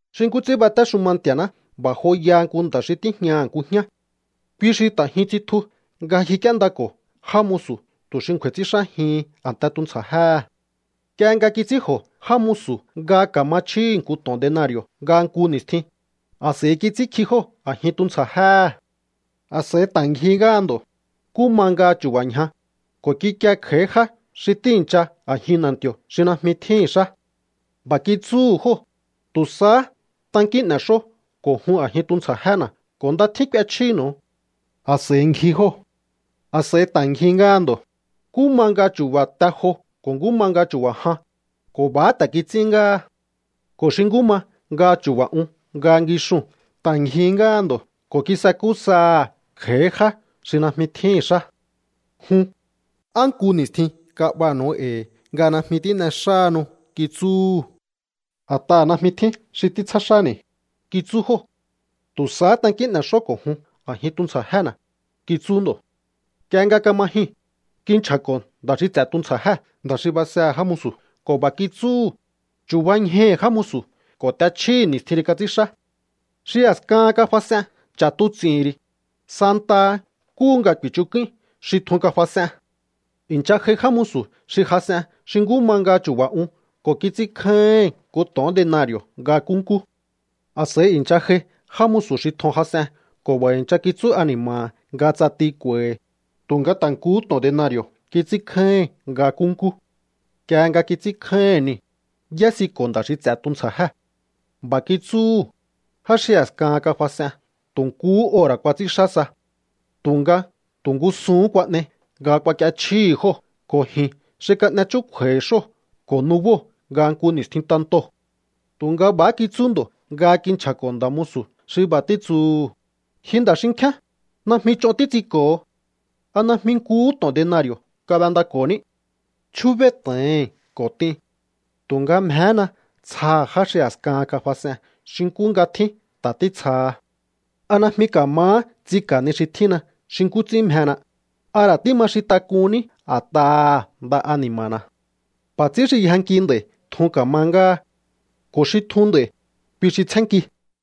’Xi nkú ts'ín batéxuma Nti̱a̱ná b'a̱ joyaha nku nda̱ xi tíjñaha̱ nku jñá. Kui xi ta̱ jyun tsitju nga ngjik'íéndako̱ já musu̱ tu̱ xi ngju̱a̱i̱ ts'ínxájihin a̱nte tuntsja̱jéhe̱. Nk'ie nga kits'ínj'o̱ já musu̱ nga ka̱ma chjíhi̱ nku to̱on denari̱o̱ nga nku ni̱stjin, a̱s'a̱i kits'ínkji jóo̱ a̱jin tuntsja̱jéhe̱. A̱s'a̱i ta̱ ngjihí ngáha ndo̱, nkú ma nga chu̱ba̱ ñja, ko̱ kikie kj'a̱í já xi tíi̱ncha a̱jin na̱nti̱o̱ xi najmi tjíhi̱n xá. B'a̱ kitsúhu̱ jóo̱: “Tu̱ sahá tankín n'e̱xó ko̱ jun a̱jin tuntsja̱jéna̱ ko̱ nda tjín k'uechjínu̱u.” A̱s'a̱i ngji jóo̱. ’A̱s'a̱i ta̱ ngjihí ngáha ndo̱, nkú ma nga chu̱ba̱ te jo ko̱ nkú ma nga chu̱ba̱ jan, ko̱ b'a̱há ta̱ kits'ín ngáha. Ko̱ xi nkú ma nga chu̱ba̱ un nga ngixuu̱n ta̱ ngjihí ngáha ndo̱ ko̱ kisakú saha̱ kj'a̱í já xi najmi tjíhi̱n xá. “Jun, ¿á nku ni̱stjin kab'aha̱nu̱u e̱i̱ nga najmi tín'exáhanu?”, kitsúhu̱. “A̱t'aha̱ najmi tjín xi títsjá xáni̱”, kitsú jóo̱. “Tu̱ sahá tankín n'e̱xó ko̱ jun a̱jin tuntsja̱jéna̱”, kitsú ndo̱. ’Nk'ie nga kama jyuu̱n, kinchja̱ko̱ nda̱ xi ts'e̱ tuntsja̱jée̱ nda̱ xi basehe̱ já musu̱ ko̱ b'a̱ kitsúhu̱: “Chu̱bañjaihi̱ já musu̱ ko̱ t'echjíhi̱ ni̱stjin xi kats'ínxá. Xi a̱skahan kafas'ee̱n ch'a̱tuts'i̱hi̱n ri̱, santaha nkúhu nga ku̱i̱chuk'uin xi tjun kafas'ee̱n.” ’I̱ncha j'ai já musu̱ xi jas'en xi nkú ma nga chu̱ba̱ un ko̱ kits'ínkjáíhi̱n nku to̱on denari̱o̱ nga nkúnkú. A̱s'a̱i i̱ncha j'ai já musu̱ xi tjun jas'ee̱n ko̱ b'a̱ i̱ncha kitsú ani̱ma̱ha̱ nga ts'ati k'u̱a̱i̱hi̱, tu̱nga ta̱ nkuhú to̱on denari̱o̱ kits'ínkjáíhi̱n nga nkúnkú. Nk'ie nga kits'ínkjáíhi̱n niu̱, y'ésiko̱ nda̱ xi ts'e̱ tuntsja̱jée̱. B'a̱ kitsúhu̱: “Já xi a̱skahan kafas'ee̱n tu̱ nkuhú ora̱ kuats'ínxá sa. Tu̱nga tu̱ ngúsuhún kuan'ei nga kuak'iechjíhi̱ jóo̱ ko̱ ji̱n xi kan'e chúkju̱a̱i̱ xóo̱ ko̱ nubóo̱ nga nku ni̱stjin tantoo̱.” ’Tu̱nga b'a̱há kitsú ndo̱ nga kinchja̱ko̱ nda̱ musu̱ xi b'a̱ títsuhu̱: “Ji nda̱ xinkjíán, najmi ch'on títs'inko̱ho. ¿A najmi nkuhú to̱on denari̱o̱ kab'endako̱ní? Chjúbéí to̱ohi̱n ko̱ t'in. Tu̱nga mjehéna tsjaha̱ já xi a̱skahan kafas'ee̱n xi nkú nga tjín ta̱ títsjaha. ¿A najmi ka̱mahá ts'inka̱ ni xi tjínna xi nkú ts'ín mjena? ¿A ra̱ tíma xin tak'unní a̱t'aha̱ nda ani̱ma̱na̱?” ’B'a̱ ts'ín xi yjanki nd'a̱i̱ tjun ka̱ma ngáha. Ko̱ xi tjun nd'a̱i̱, kui xi tsjénnki.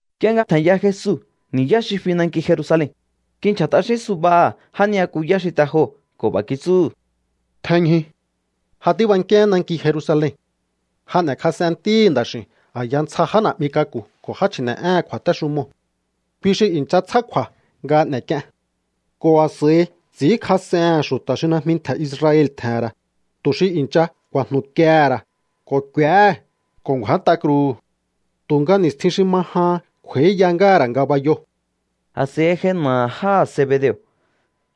Nk'ie nga tje̱nya Jesu ni̱yá xi fi nanki Jerusalen, kinchja̱ t'axín subaha̱ já ni'yakuyá xi te joo̱ ko̱ b'a̱ kitsúhu̱: —Tjenñju. Ja tíbankíaán nanki Jerusalen. Ja n'e̱kjas'en Ntíhi̱ Nda̱x'i̱u̱n a̱ya ntsja já na̱'mi k'aku̱ ko̱ já chji̱ne̱'éhe̱n kju̱a̱téxumoo̱. Kui xi i̱ncha tsjá kju̱a̱ nga n'e̱k'ien ko̱ a̱s'a̱i ts'i̱ínkjas'ehe̱n xu̱ta̱ xi najmi ntje̱ Israel tje̱he̱n ra̱, tu̱ xi i̱ncha ku̱a̱jnu̱kiehe̱ ra̱ ko̱ k'u̱éhe̱ ko̱ ngju̱át'a kruu̱hu̱. Tu̱nga ni̱stjin xi ma jahan kj'u̱a̱íya ngáha̱ ra̱ ngabayoo̱. A̱s'a̱i j'ai na̱aha̱ jáha̱ Zebedeo̱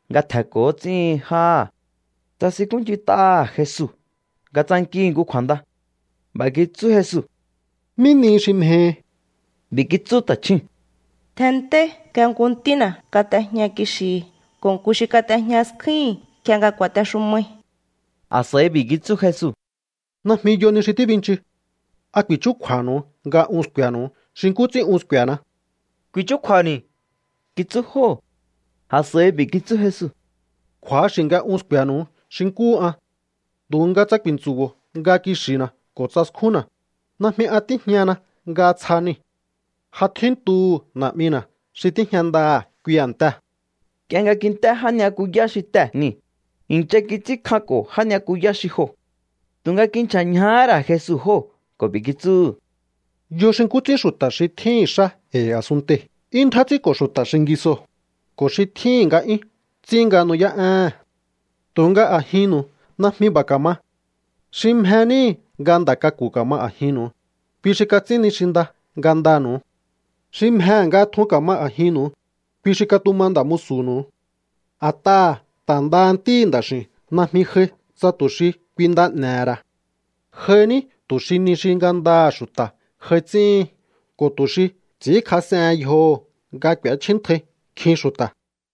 nga tje̱nko̱ ts'íhin jáha̱. Tsasinkúnch'int'aha̱ Jesu nga tsankihi̱ nku kju̱a̱nda. B'a̱ kitsú Jesu: —¿Mí nihi xi mjehi? B'i̱ kitsú ta̱chjúu̱n: —Tjenntei nga nku ntína̱ kat'ejña kixi̱hi̱ ko̱ nku xi kat'ejña skjúhi̱n nk'ie nga ku̱a̱texumai. A̱s'a̱i b'i̱ kitsú Jesu: —Najmi yo ni xi tíbinchu. ¿A ku̱i̱chúkju̱a̱nu̱u nga un sku̱e̱nu̱u xi nkú ts'ín un sku̱e̱na? —Ku̱i̱chúkju̱a̱ni̱ —kitsú jóo̱. A̱s'a̱i b'i̱ kitsú Jesu: —Kju̱axi̱ nga un sku̱e̱nu̱u xi nkúhu an. Tu̱nga tsa ku̱i̱ntsu̱bo̱o nga kixi̱na̱ ko̱ tsa skjúnna̱, najmi an tíjñana nga tsja niu̱. Ja tjíntu̱hu̱ Na̱'mina̱ xi tíjña ndaha̱ kui a̱ntee̱. Nk'ie nga kint'é já ni'yakuyá xi tee̱ niu̱, i̱ncha kits'ínkjanko̱ já ni'yakuyá xi joo̱. Tu̱nga kinchja̱ ñjahá ra̱ Jesu jóo̱ ko̱ b'i̱ kitsúhu̱: —Yo xi nkú ts'ín xu̱ta̱ xi tjíhi̱n xá e̱i̱ a̱sunntei̱ 'yún ndjá ts'ínko̱ xu̱ta̱ xingisoo̱, ko̱ xi tjíhi̱n nga'yún ts'ín nga nu'yá'éhe̱n. Tu̱nga a̱jinnu̱u najmi b'a̱ ka̱ma. Xi mje níhi̱ nga nda̱ k'aku̱ ka̱ma a̱jinnu̱u, kui xi kats'ín ni xi nda ngandanu̱u. Xi mjehe̱ nga tjun ka̱ma a̱jinnu̱u, kui xi katuma nda̱ musu̱nu̱u. A̱t'aha̱ ta̱ ndaha Ntíhi̱ Nda̱x'i̱u̱n najmi j'ai tsa tu̱ xi kui nda n'e̱he̱ ra̱. J'ai ní tu̱ xi ni xi ngandaha̱ xu̱ta̱ j'ai ts'íhin ko̱ tu̱ xi ts'i̱ínkjas'ehen yjoho̱ nga k'u̱échjíntjai nkjin xu̱ta̱.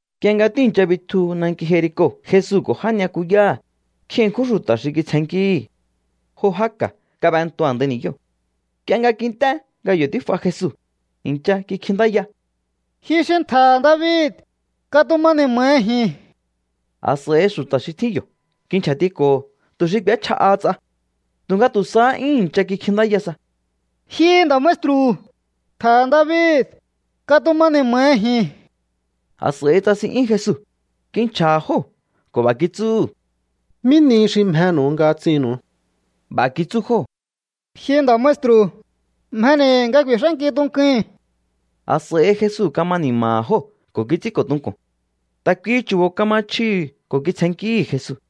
Nk'ie nga tíi̱ncha bitju nanki Jerico Jesu ko̱ já ni'yakuyáha̱, nkjin ṉkjún xu̱ta̱ xi kitsjennkíhi̱. Jo já ka̱ kab'entu a̱ndai ni̱yóo̱. Nk'ie nga kint'é nga yo̱ tíf'a Jesu, i̱ncha kikjintáya: —¡Ji xi ntje̱he̱ David, katuma ni̱ma̱hi ji̱n! A̱s'a̱i xu̱ta̱ xi tjín yo̱ kinchja̱tiko̱ho̱ tu̱ xi k'u̱échja'aha ts'a. Tu̱nga tu̱ sahá 'yún i̱ncha kikjintáya sa: —¡Ji nda̱ maestru̱, ntje̱he̱ David, katuma ni̱ma̱hi ji̱n! A̱s'a̱i tsasin'yún Jesu, kinchja̱ha̱ jóo̱ ko̱ b'a̱ kitsúhu̱: —¿Mí nihi xi mjenu̱u nga ts'innu̱u? B'a̱ kitsú jóo̱: —Ji nda̱ maestru̱, mjeni̱ nga ku̱i̱x'ánki tunkui̱n. A̱s'a̱i Jesu kama ni̱ma̱ha̱ jóo̱ ko̱ kits'ínko̱ tunku̱n. Ta̱ kuihi chu̱bo̱ kama chjihi̱ ko̱ kitsjennkíhi̱ Jesu.